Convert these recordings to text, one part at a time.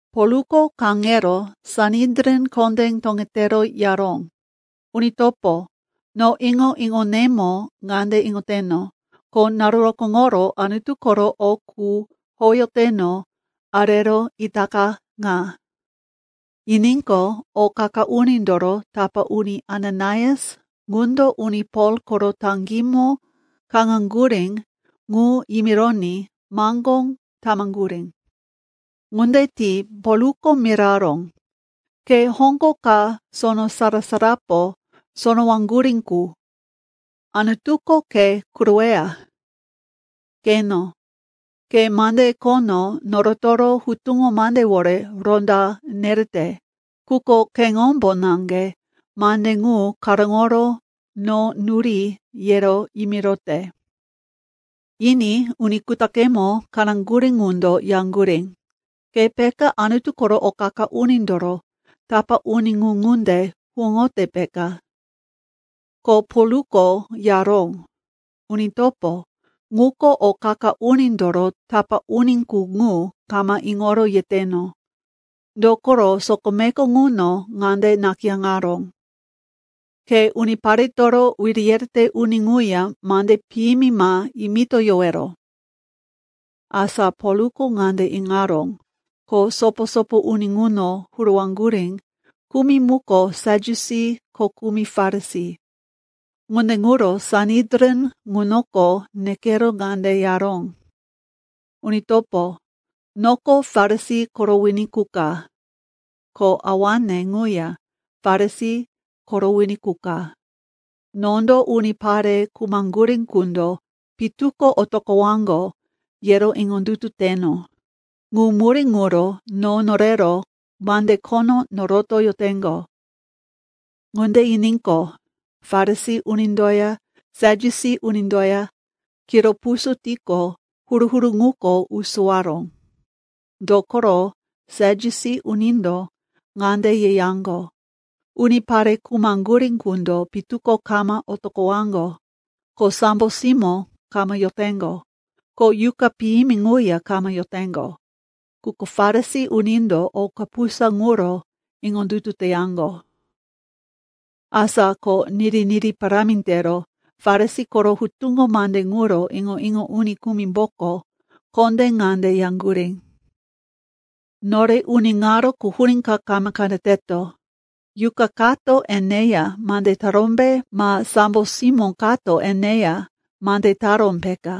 Polko kaŋero Sanedrin kondé toŋetero yaró, “Uni topo, no iŋo-iŋonemo ŋande iŋoteno, ko naru rokóŋoro Anutu koro o qu howeyoteno arero itaka ŋa.” Yiníqo, o qa-qa unindoro tapá uni Ananias ŋundo uni Pol koro taŋgímo kaŋaŋgurí ŋu yimironí maŋgó tamaŋgurí. Ŋunde ti Polko miraró, “Ke hoŋgo ka sono sara-sarapo sonowaŋgurí qu! Anutuko ke kuroweya! Qeno, ke mande khono norotoro hutuŋo mandewore ronda nerete, quko keŋombo naŋge mande ŋu karóŋoro no nuri yero yimirote!” Yiní uni kutaqemo kaŋaŋgurí ŋundo yaŋgurí, “Ke peka Anutu koro o qa-qa unindoro tapá uni ŋu ŋunde huwóŋote, peka?” Ko Polko yaró, “Uni topo, ŋuko o qa-qa unindoro tapá uni qu ŋu kama iŋoro yeteno. Dokoro sokomeko ŋuno ŋande nakayáŋaró, ‘Ke uniparetoro wiri yerete uni ŋuya mande piyimi ma yimitoyowero.’” Asa Polko ŋande iŋaró, ko sopo-sopo uni ŋuno huruwaŋgurí kumi muko Sadyusi ko kumi Farisi. Ŋunde ŋuro Sanedrin ŋunoko nekero ŋande yaró, “Uni topo, noko Farisi koro wini qu ka, ko awane ŋuya Farisi koro wini qu ka. Nondo unipare khumaŋgurí qundo pitu ko otoqowaŋgo, yero iŋondutu teteno. Ŋu murí ŋuro no norero mande khono norotoyoteŋgo.” Ŋunde yiníqo, Farisi unindoya Sadyusi unindoya kiro puso tiqo, huru-huru ŋuko usowaró. Dokoro Sadyusi unindo ŋande yeyaŋgo, unipare khumaŋgurí qundo pitu ko kama otoqowaŋgo, ko sambo simó kama yoteŋgo, ko yuqa piyimi ŋuya kama yoteŋgo. Quko Farisi unindo o kapusa ŋuro iŋondutu teyaŋgo. Asa ko niri-niri parámi tero Farisi koro hutuŋo mande ŋuro iŋo-iŋo uni kumimboko kondé ŋande yaŋgurí, “Nore uni ŋaro quhurí ka kama qeneteto. Yuqa kato eneya mande tarómbe, ma sambo simó kato eneya mande taró, peka.”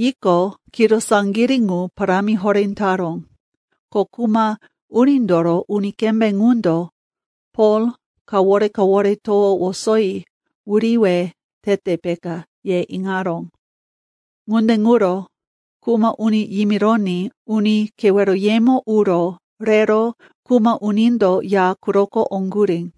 Yiqo, kiro saŋgirí ŋu parámi horé taró, ko kuma unindoro uni kembé ŋundo, Pol kawore-kawore towo wosoyi wuriwe tete, peka, ye iŋaró. Ŋunde ŋuro kuma uni yimironí uni keweroyemo uro rero kuma unindo ya quroko oŋgurí.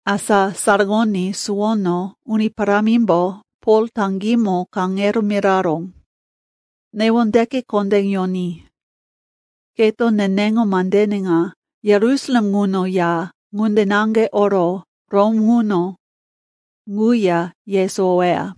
Asa saraŋoní suwono Uni Parámimbo Pol taŋgímo kaŋero miraró, “Newondeke kondé yoní. Keto neneŋo mandene ŋa Yerusalem ŋuno ya, ŋunde naŋge oro Rom ŋuno ŋuya yesowoweya.”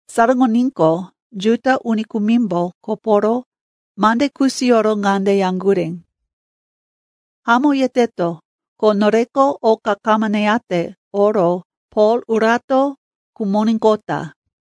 Saraŋoníqo, Juda uni kumimbo koporo mande kusiyoro ŋande yaŋgurí, “Hamó yeteto, ko noreko oka kama neyate oro Pol urato khumoníqota.”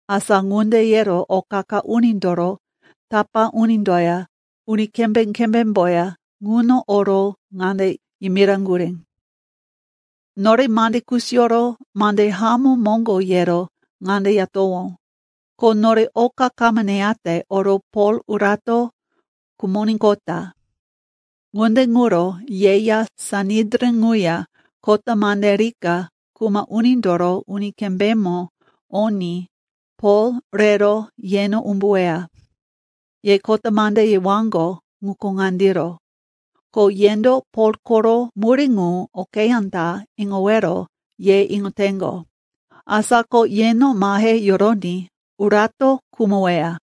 Asa ŋunde yero o qa-qa unindoro tapá unindoya uni kembé-kembémboya ŋuno oro ŋande yimiraŋgurí, “Nore mande kusiyoro mande hamó moŋgo yero ŋande yatowó, ko nore oka kama neyate oro Pol urato khumoníqota. Ŋunde ŋuro yeya Sanedrin ŋuya kota mande rika kuma unindoro uni kembémo oní Pol rero yeno umbuweya. Ye kota mande yewaŋgo ŋuko ŋandiro, ko yendo Pol koro murí ŋu okeyá ta iŋowero ye iŋoteŋgo. Asa ko yeno mahe yoroní urato khumoweya.”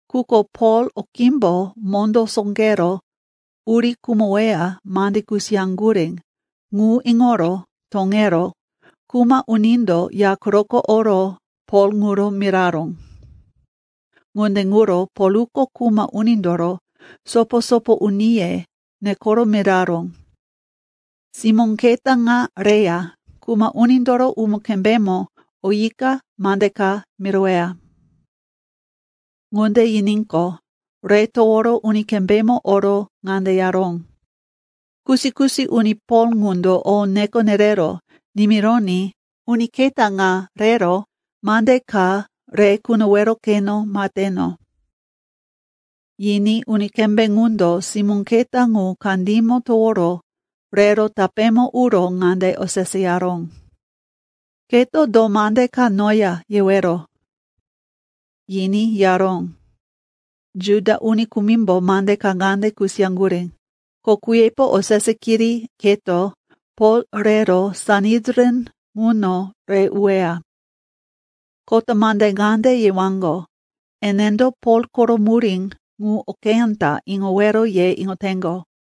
Quko Pol okímbo mondó sóqero uri khumoweya mande kusiyaŋgurí ŋu iŋoro toŋero kuma unindo ya quroko oro Pol ŋuro miraró. Ŋunde ŋuro Polko kuma unindoro sopo-sopo uniye nekoro miraró, “Simó keta ŋa reya kuma unindoro uni kembémo oyika mande ka miroweya.” Ŋunde yiníqo, re toworo uni kembémo oro ŋande yaró, “Kusi-kusi uni Pol ŋundo no neko nerero nimironí uni keta ŋa rero mande ka re kunowero keno maheteno.” Yiní uni kembé ŋundo simó keta ŋu kandímo toworo rero tapémo uro ŋande oseseyaró, “Keto do mande ka noya yewero?” Yiní yaró, “Juda uni kumimbo mande ka ŋande kusiyaŋgurí, ko kuyepo osese kiri keto Pol rero Sanedrin ŋuno re uweya. Kota mande ŋande yewaŋgo, enendo Pol koro murí ŋu okeyá ta iŋowero ye iŋoteŋgo.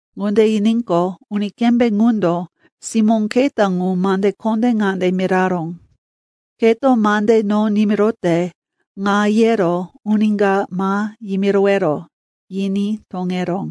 Ŋunde yiníqo, uni kembé ŋundo simó keta ŋu mande kondé ŋande miraró, “Keto mande no nimirote ŋa yero uni ka ma yimirowero” yiní toŋeró.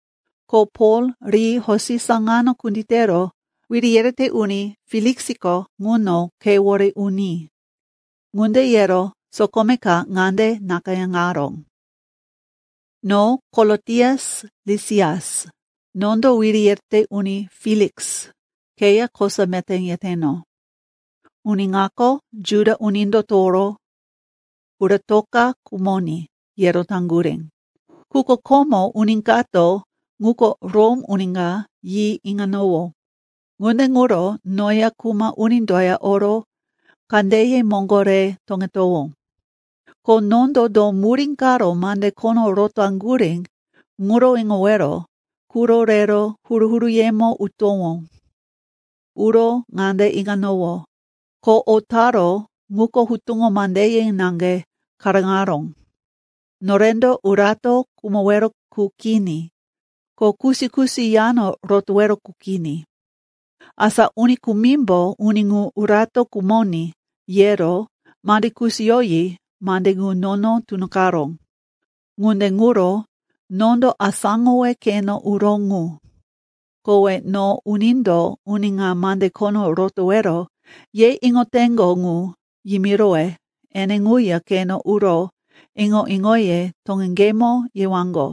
Ko Pol ri hosi saŋano kunditero wiri yerete uni Feliksiko ŋuno khewore uní.” Ŋunde yero sokome ka ŋande nakayáŋaró. No Kolotias Lisias, nondo Wiri Yerete Uni Feliks, keya kosa meté yeteno. Uni ŋako, Juda unindo toworo, uratoka khumoní, yero taŋgurí. Quko komo uni kato, ŋuko Rom uni ka, yi iŋanowó, ŋunde ŋuro noya kuma unindoya oro kandeye moŋgo re toŋetowó. Ko nondo do murí karo mande khono rotaŋgurí ŋuro iŋowero quro rero huru-huruyemo utowó. Uro ŋande iŋanowó, ko o taró ŋuko hutuŋo mandeye naŋge karóŋaró, norendo urato khumowero qu kini, ko kusi-kusi yano rotowero qu kini. Asa uni kumimbo, uni ŋu urato khumoní, yero mande kusiyoyi mande ŋu nono tunoqaró. Ŋunde ŋuro nondo asáŋowe keno uró ŋu. Kowe no unindo uni ŋa mande khono rotowero ye iŋoteŋgo ŋu yimirowe ene ŋuya keno uro iŋo-iŋoye toŋeŋgemo yewaŋgo.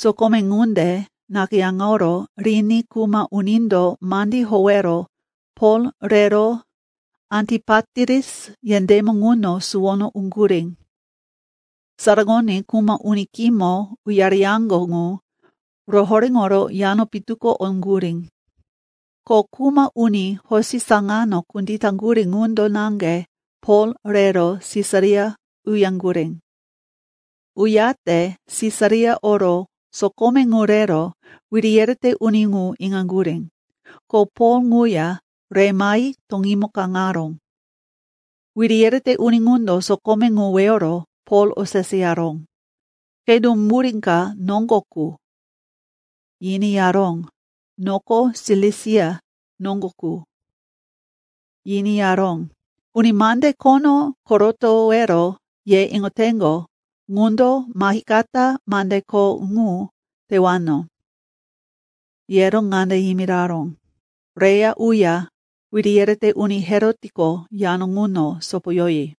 Sokome ŋunde nakayáŋoro riní kuma unindo mandí howero Pol rero Antipatiris yendémo ŋuno suwono uŋgurí. Saraŋoní kuma uni khímo uyareyaŋgo ŋu rohoréŋoro yano pitu ko oŋgurí. Ko kuma uni hosi saŋano kunditaŋgurí ŋundo naŋge Pol rero Sisaria uyaŋgurí. Uyate Sisaria oro sokome ŋu rero wiri yerete uni ŋu inaŋgurí, ko Pol ŋuya re mahi toŋímo kaŋaró. Wiri yerete uni ŋundo sokome ŋu weyoro Pol oseseyaró, “Ke do mira ka noŋgo qu?” Yiní yaró, “Noko Silisia noŋgo qu.” Yiní yaró, “Uni mande khono korotowero ye iŋoteŋgo ŋundo mahikata mande kho ŋu tewano.” Yero ŋande yimiraró, “Reya uya wiri yerete uni Herotko yano ŋuno sopoyoyi.”